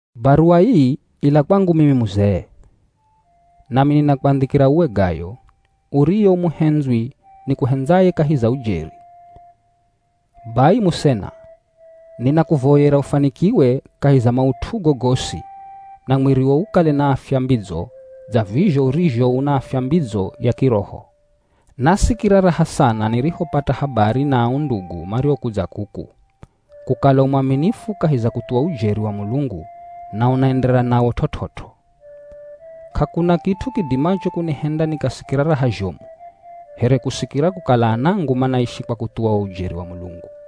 Baruwa ii ila kwangu mimi muzee. Nami ninakwandhikira uwe Gayo, uriye u muhendzwi nikuhendzaye kahi za ujeri. Bai musena, ninakuvoyera ufanikiwe kahi za maut'ugo gosi na mwiriwo ukale na afya mbidzo dza vizho urizho una afya mbidzo ya kiroho. Nasikira raha sana nirihopata habari na ao ndugu mariokudza kuku, kukala u mwaminifu kahi za kuthuwa ujeri wa Mulungu na unaenderera nawo t'ot'ot'o. K'akuna kit'u kidimacho kunihenda nikasikira raha zhomu, here kusikira kukala anangu manaishi kwa kuthuwa wo ujeri wa Mulungu.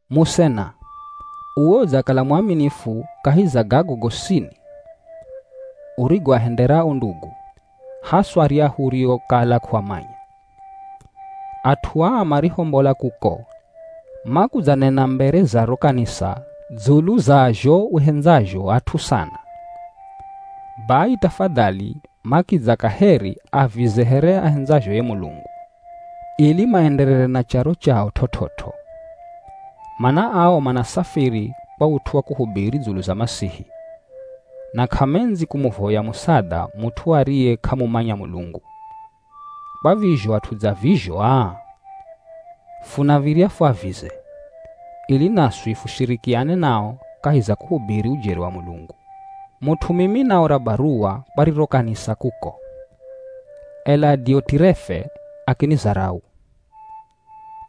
Musena, uwe udzakala mwaminifu kahi za gago gosini urigoahendera o ndugu, haswa aryahu uriokala k'uamanya. At'u aa marihombola kuko, makudzanena mbere za ro kanisa dzulu za zho uhendzazho at'u sana. Bai tafadhali makidza kaheri avize here ahendzazho ye Mulungu, ili maenderere na charo chao t'ot'ot'o. Mana ao manasafiri kwa ut'u wa kuhubiri dzulu za Masihi, na k'amendzi kumuvoya musadha mut'u ariye k'amumanya Mulungu. Kwa vizho at'u dza vizho aa, funav̱irya fuavize, ili naswi fushirikiane nao kahi za kuhubiri ujeri wa Mulungu. Mut'u mimi naora baruwa kwa riro kanisa kuko, ela Diotirefe akinizarau.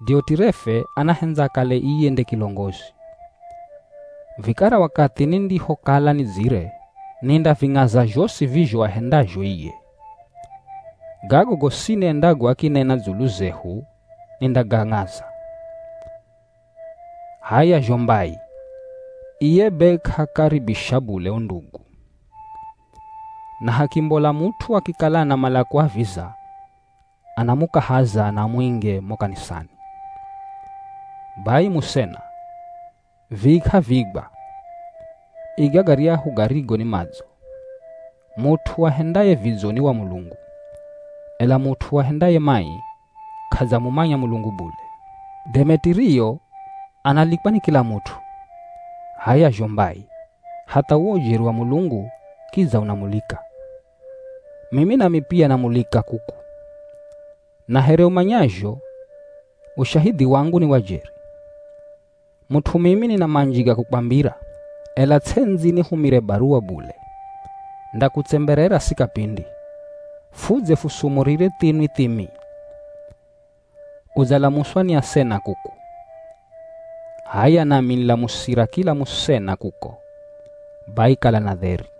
Diotirefe anahendza akale iye nde kilongozi. Vikara wakathi nindihokala nidzire, nindaving'aza zhosi vizho ahendazho iye. Gago gosini endago akinena dzulu zehu nindagang'aza. H'aya zho mbai, iye be k'aakaribisha bule o ndugu, na hakimbola mut'u akikala anamala kuaviza, anamukahaza na amuinge mo kanisani. Bai musena, vii k'aviigwa, iga garyahu garigo ni madzo. Mut'u ahendaye vidzo ni wa Mulungu, ela mut'u ahendaye mai, k'adzamumanya Mulungu bule. Demetirio analikwa ni kila mut'u, h'aya zho mbai, hatha uwo ujeri wa Mulungu kidza unamulika. Mimi nami pia namulika kuku, na here umanyazho ushahidhi wangu ni wa jeri. Mut'u mimi nina manji ga kukwambira, ela ts'endzi nihumire baruwa bule. Ndakutsemberera si kapindi, fudze fusumurire thinwi thimi. Udzalamuswa ni asena kuku. H'aya nami nilamusira kila musena kuko. Bai kala na dheri.